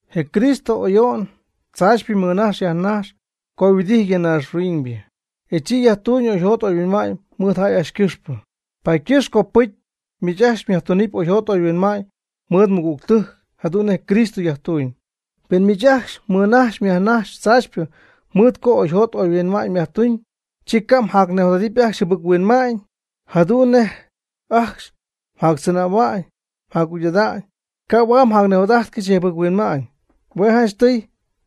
Je Cristo ayo'n tzaachypɨ mɨnajx yajnajx co yhuɨdijty ya naaxhuiñybɨ, e chi yajtuuñ oyjot oyhuinma'ñ mɨɨd jäy ajcxy ycɨxpɨ. Paady ycɨxpɨ copɨcy miich ajcxy myajtunɨpy oyjot oyhuinma'ñ mɨɨd mɨgügtɨjc jadu'n nej Cristo yajtuuñ. Pen miich ajcxy mmɨnajxyp myajnajxyp tzaachypɨ mɨɨd co oyjot oyhuinma'ñ myajtuñ, chi ca' mjacnijot'ajtɨp ajcxy jɨbɨc-huinma'ñ. Jadu'n nej ajcxy mjactzɨnähua'ñ mjacjugy'ada'ñ, ca' huaad mjacnijot'ajtcɨxy je jɨbɨc-huinma'ñ. Hue' janchtɨy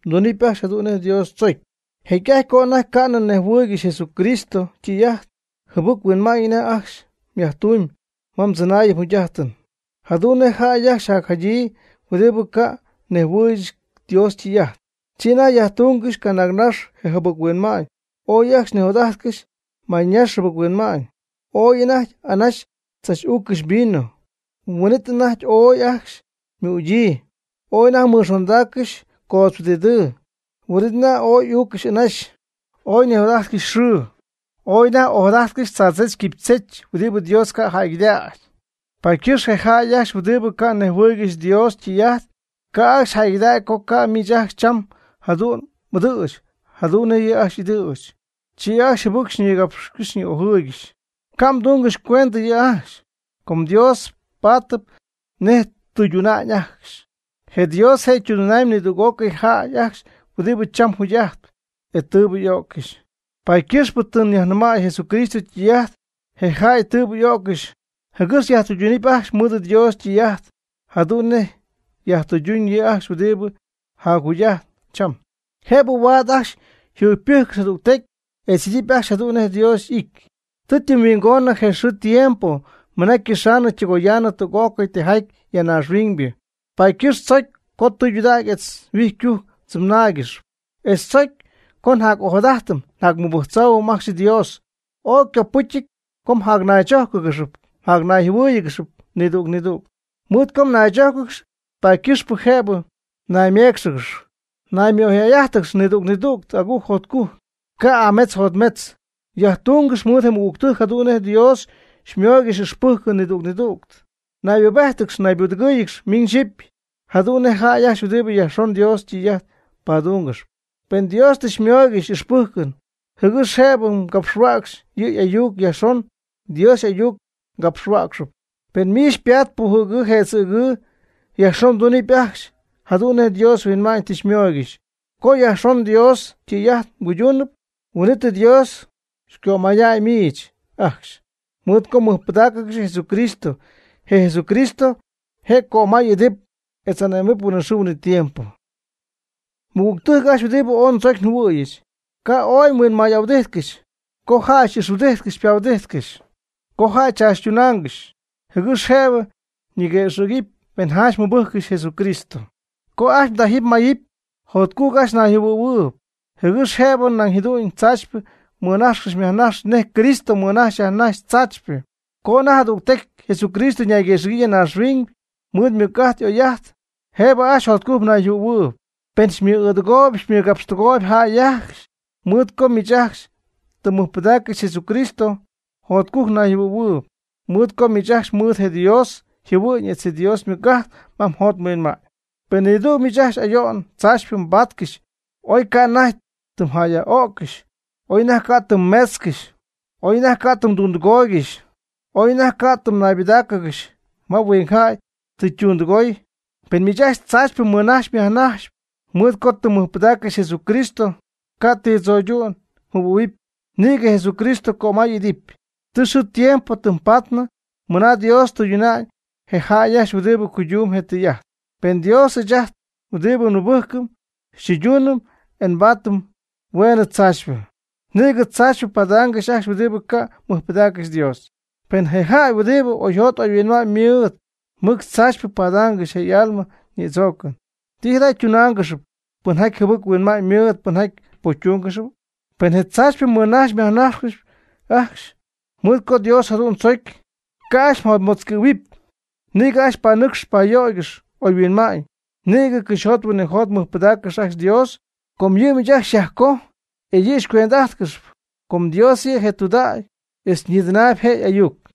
mdunɨpy ajcxy jadu'n nej Dios tzocy. Jecy'ajty co anajty ca'nɨ mnejhuɨɨygɨxy Jesucristo ytɨy'ajt, jɨbɨc-huinma'ñ anajty ajcxy myajtumyb ma mdzɨnaayɨn mjugy'ajtɨn, jadu'n nej jäy ajcxy jacjadyii huɨdibɨ ca'nɨ nejhuɨɨygɨxy Dios ytɨy'ajt. Chi anajty myajtungɨxy canaagnax je jɨbɨc-huinma'ñ, ooy ajcxy mnijot'ajtcɨxy maynax jɨbɨc-huinma'ñ. Ooy anajty anaxy mdzach'üccɨxy vino, huin'it anajty ooy ajcxy ymügyii. Ooy anajty mnixondaaccɨxy coodz huɨdidɨɨ, huin'it anajty ooy m'uuccɨxy anaxy. Ooy mnijot'ajtcɨxy xɨɨ, ooy anajty m'ojadajtcɨxy tzaadzech quipychech huɨdibɨ Dios ca' jäygɨdägy. Paady ycɨxpɨ je jäy ajcxy huɨdibɨ ca' nejhuɨɨygɨxy Dios ytɨy'ajt, ca' ajcxy jäygɨdägy co ca' miich ajcxy cham jadu'n m'ɨdɨ̈ch jadu'n nej yɨ' ajcxy y'ɨdɨ̈ch, chi ajcxy jɨbɨc xyñigapxcɨxy xyñi'ojɨɨygɨxy. Ca' mdungɨxy cuendɨ yɨ' ajcxy, com Dios paatɨp nej ytɨyduna'ñ ajcxy. Je Dios je' tɨydunamb nidüg'ócɨy jäy ajcxy huɨdibɨ cham jugy'ajtp, etz tɨɨbɨ y'öccɨxy. Paady ycɨxpɨ tɨ yajnɨmäy Jesucristo ytɨy'ajt je jäy tɨɨbɨ y'öccɨxy jɨgɨx yajtɨydunɨpy ajcxy mɨɨd Dios ytɨy'ajt jadu'n nej yajtɨyduna'ñ yɨ' ajcxy huɨdibɨ jacjugy'ajtp cham. Jëbɨ huaad ajcxy yjugypɨjccɨxy jadügtecy etz y'idɨpy ajcxy jadu'n nej Dios y'ity. Tɨ ytɨmyhuingonɨ je xɨɨ je tiempo mɨna ycɨxaanɨ ytɨgoyaanɨ tüg'ócɨy tijaty ya naaxhuiñybɨ. Paady ycɨxp tzocy co tɨydudägy etz huijycujc mdzɨnaygɨxɨpy, etz tzocy co mjac'ojadadɨpy mjacmɨbɨjctzoohuɨpy ajcxy Dios. Ooy ycopɨcyɨty co jacnaychójcɨgɨx jacnayjɨhuɨ́ɨyɨgɨx nidüg nidüg. Mɨɨd co mnaychójcɨgɨxy, paady ycɨxpɨ jëbɨ mnayméecxɨgɨxy. Naymɨ'oyjäy'ájtɨgɨx nidüg nidüg agujc jotcujc, ca' y'ametz yjotmetzɨty. Yajtungɨx mɨɨd je mɨgügtɨjc jadu'n nej Dios xymooygɨxy ixpɨjcɨn nidüg nidüg. Naybubéjtɨgɨx naybudɨgɨ́ɨyɨgɨx miñ xyipy jadu'n nej jäy ajcxy huɨdibɨ yajxon Dios ytɨy'ajt padungɨxp. Pen Dios tɨ xymooygɨxy ixpɨjcɨn jɨgɨx jëbɨ capxhuäcxy yɨ' y'ayuc, yajxon Dios y'ayuc mgapxhuäcxɨp. Pen miich xypaat pujɨ̈gɨɨ jëdzɨ̈gɨɨ, yajxon mdunɨpy ajcxy jadu'n nej Dios huinma'ñ tɨ xymooygɨxy. Co yajxon Dios ytɨy'ajt mguyduunɨpy, huin'it Dios cömaya'ñ miich ajcxy, mɨɨd co tɨ mmɨjpɨdaaccɨxy Jesucristo. Je Jesucristo je' cömay'idɨp etz ane'mɨp huinɨxɨɨ huinɨtiempo. Mɨgügtɨjc ajcxy huɨdibɨ ooy ndzocy njɨhuɨ̈yɨch, ca' ooy mhuinmay'ahuɨdijtcɨxy co jäy xy'ixhuɨdijtcɨxy xypahuɨdijtcɨxy, co jäy xychaachytunaangɨxy jɨgɨx jëbɨ ñiguëxɨ̈gɨpy pen janch mmɨbɨjccɨxy Jesucristo. Ca' ajcxy mdajɨpy mmayɨpy, jotcujc ajcxy mnayjɨhuɨ̈huɨɨyb jɨgɨx jëbɨ nañ jadu'n tzaachypɨ mmɨnajxcɨxy myajnajxcɨxy nej Cristo mɨnajxy yajnajxy tzaachypɨ. Co anajty jadügtecy Jesucristo ñayguëxɨ̈gyii ya naaxhuiñ mɨɨd ymɨc'ajt y'oy'ajt, jëbɨ ajcxy jotcujc mnayjɨhuɨ̈huɨɨb. Pen xymɨ'ɨɨdɨgooyb xymɨgapxtɨgooyb jäy ajcxy, mɨɨd co miich ajcxy tɨ mmɨjpɨdaaccɨxy Jesucristo, jotcujc mnayjɨhuɨ̈huɨpy, mɨɨd co miich ajcxy mɨɨd je Dios yjɨhuɨ'ñ etz Dios ymɨc'ajt ma mjot mhuinma'ñ. Pen nidüg miich ajcxy ayo'n tzaachypɨ mbaatcɨxy, oy ca' anajty tɨ mjäyyaj'öccɨxy, oy anajty ca' tɨ mmeetzcɨxy, oy anajty ca' tɨ mdundɨgooygɨxy, oy anajty ca' tɨ mnaybɨdáacɨgɨxy ma huingjäy tɨ ytundɨgooy, pen miich ajcxy tzaachypɨ mmɨnajxyp myajnajxp mɨɨd co tɨ mmɨjpɨdaaccɨxy Jesucristo, ca' ti tzo'ydu'n mjɨhuɨ̈huɨpy, nïgɨ Jesucristo cömay'idɨpy. Tɨ xɨɨ tiempo tɨm paatnɨ mɨna Dios tɨyduna'ñ je jäy ajcxy huɨdibɨ cuydumb je' ytɨy'ajt. Pen Dios ɨɨch ajt huɨdi nmɨbɨjcɨm xytɨyduunɨm e nbaatɨm hueenɨ tzaachypɨ, nïgɨ tzaachypɨ padaangɨxy ajcxy huɨdibɨ ca' mɨjpɨdaaccɨxy Dios. Pen je jäy huɨdibɨ oyjot oyhuinma'ñ mɨɨd mɨc tzaach padaangɨxy je' y'alma nïdzoocɨn, ¿ti jada ytunaangɨxy pɨnjaty jɨbɨc-huinma'ñ mɨɨd, pɨnjaty pocytungɨx? Pen tzaachypɨ mmɨnajxyp myajnajxyp ajcxy mɨɨd co Dios jadu'n chojcyp, ca' ajcxy mjotmetzcɨ̈huɨpy, nïgɨ ajcxy panɨcxcɨx payöygɨx oyhuinma'ñ, nïgɨ cɨxyjot huinɨjot mɨjpɨdägɨpy ajcxy Dios; com yɨ' miich ajcxy xyajcoj, e yɨ' xycuend'ajtcɨxp; com Dios yɨ' je' tudägy etz ñïdɨnaayb je' y'ayuc.